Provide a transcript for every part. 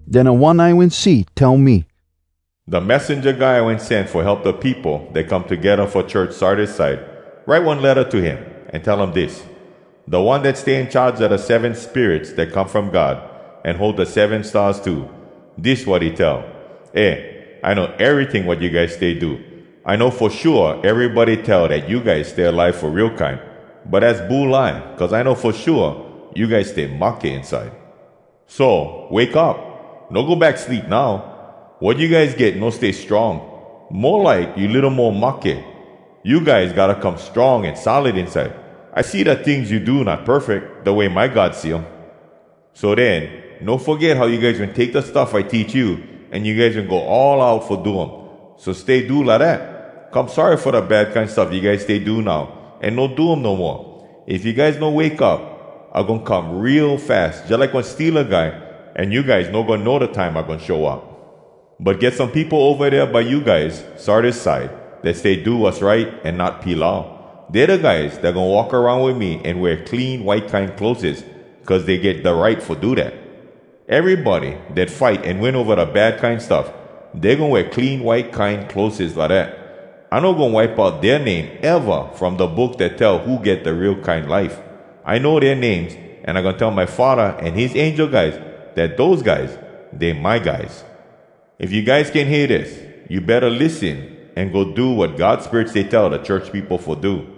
Den da One I wen see tell me, “Da messenja guy I wen sen fo help da peopo dat come togedda fo church Sardis side, write one letta to him, an tell um dis: “Da One dat stay in charge a da seven spirits dat come from God, an hold da seven stars too, dis wat he tell: ‘Eh, I know eryting wat you guys stay do! I know fo shua erybody tell dat you guys stay alive fo real kine! But az bulai, cuz I know fo shua you guys stay mahke inside. So, wake up! No go back sleep now! Wat you guys get no stay strong. Mo like you litto mo mahke! You guys gotta come strong an solid inside! I see da tings you do not perfeck, da way my God see um. So den, no foget how you guys wen take da stuff I teach you, an you guys wen go all out fo do um. So, stay do lidat. Come sorry fo da bad kine stuff you guys stay do now, an no do um no moa. If you guys no wake up, I goin come real fas, jalike one steala guy, an you guys no goin know da time I goin show up.’ “‘But get some peopo ova dea by you guys Sardis side dat stay do wass right an not pilau. Dey da guys dat goin walk aroun wit me an wear clean white kine clotheses, cuz dey get da right fo do dat.’” Erybody dat fight an win ova da bad kine stuff, Dey goin wear clean white kine clotheses lidat. I no goin wipe out dea name eva From da Book Dat Tell Who Get Da Real Kine Life! I know dea names, An I goin tell my Faddah an his angel guys Dat dose guys, dey my guys. If you guys can hear dis, you betta lissen an go do wat God Spirit stay tell da church peopo fo do!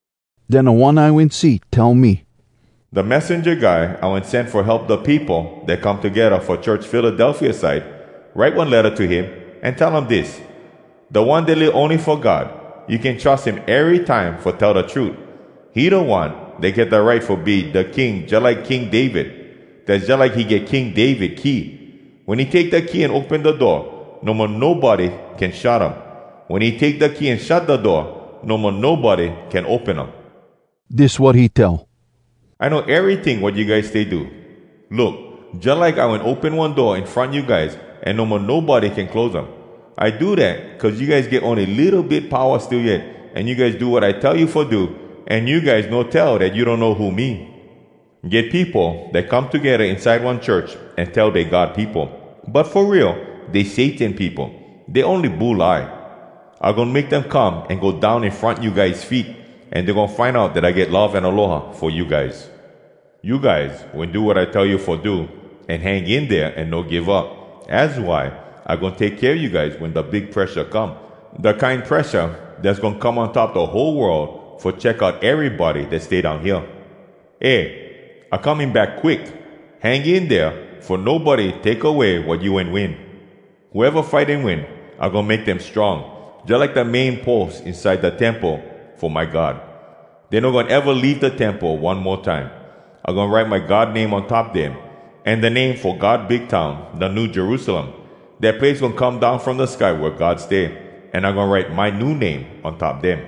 Den da One I wen see tell me, “Da messenja guy I wen sen fo help da peopo dat come togedda fo church Philadelphia side, write one letta to him, an tell um dis: “Da One dat live ony fo God, you can trus him erytime fo tell da trut. He da One dat get da right fo be da King jalike King David. Dass jalike he get King David key. Wen he take da key an open da door, no mo nobody can shut um. Wen he take da key an shut da door, no mo nobody can open um. Dis wat he tell: “‘I know eryting wat you guys stay do. Look! Jalike I wen open one door in front you guys, an no mo nobody can close um. I do dat cuz you guys get ony litto bit powa still yet, an you guys do wat I tell you fo do, an you guys no tell dat you donno who me. Get peopo dat come togedda inside one church, an tell dey God peopo. But fo real, dey Satan peopo. Dey ony bulai. I goin make dem come an go down in front you guys feet. An dey goin find out dat I get love an aloha fo you guys. You guys wen do wat I tell you fo do, an hang in dea an no give up. Az why I goin take kea you guys wen da big presha come, da kine presha dass goin come on top da whole world fo check out erybody dat stay down hea.’ “Eh, I coming back quick! Hang in dea fo nobody take away wat you wen win.” Whoeva fight an win, I goin make dem strong Jalike da main pos inside da temple fo my God. Dey no goin eva leave da temple one mo time! I goin write my God name on top dem, An da name fo God big town, da new Jerusalem. Dat place goin come down from da sky wea God stay. An I goin write my new name on top dem.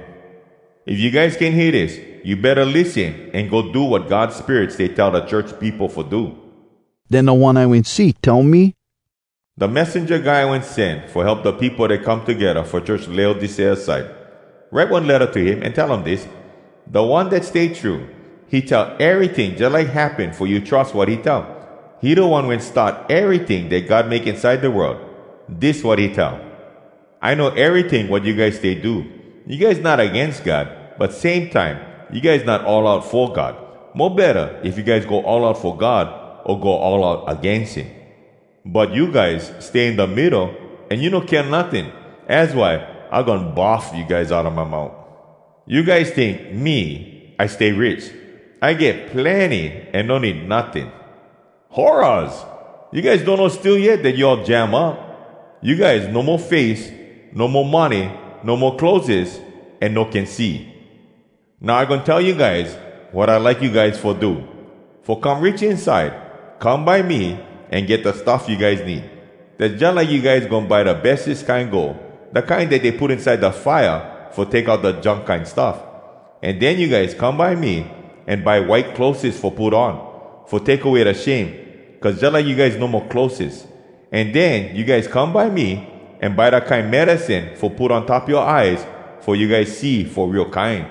If you guys can hear dis, you betta lissen an go do wat God Spirit stay tell da church peopo fo do! Den da One I wen see tell me, “Da messenja guy I wen sen fo help da peopo dat come togedda fo church Laodicea side, write one letta to him, an tell um dis: “Da One dat stay true, he tell eryting jalike happen fo you trus wat he tell. He da one wen start eryting dat God make inside da world. Dis wat he tell: ‘I know eryting wat you guys stay do. You guys not agains God, but same time, you guys not all out fo God! Mo betta if you guys go all out fo God, o go all out agains him. But you guys stay in da middo an you no kea notting. Az why I goin bahf you guys outa my mout! You guys tink, “Me, I stay rich. I get plenny, an no need notting!” Horraz! You guys donno still yet dat you all jam up! You guys no mo face, no mo money, no mo clotheses, an no can see!’ “‘Now I goin tell you guys wat I like you guys fo do. Fo come rich inside, come by me an get da stuff you guys need. Dass jalike you guys goin buy da bestes kine gold, da kine dat dey put inside da fire fo take out da junk kine stuff. An den you guys come by me an buy white clotheses fo put on, fo take away da shame, cuz jalike you guys no mo clotheses! An den you guys come by me an buy da kine medicine fo put on top yoa eyes fo you guys see fo real kine!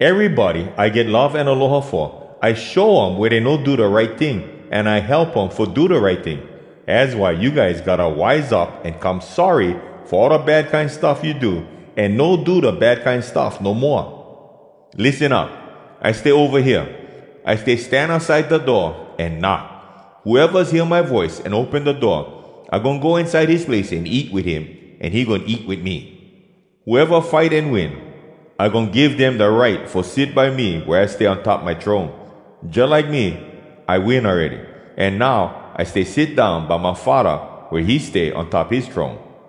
Erybody I get love an aloha fo, I show um wea dey no do da right ting, an I help um fo do da right ting. Az why you guys gotta wise up an come sorry fo all da bad kine stuff you do, an no do da bad kine stuff no moa. Lissen up! I stay ova hea. I stay stand outside da door an knock. Whoevas hear my voice, an open da door, I goin go inside his place, an eat wit him, an he goin eat wit me.’” Whoeva fight an win, I goin give dem da right Fo sit by me wea I stay on top my throne. Jalike me, I win awready, An now I stay sit down by my Faddah Wea he stay on top his throne.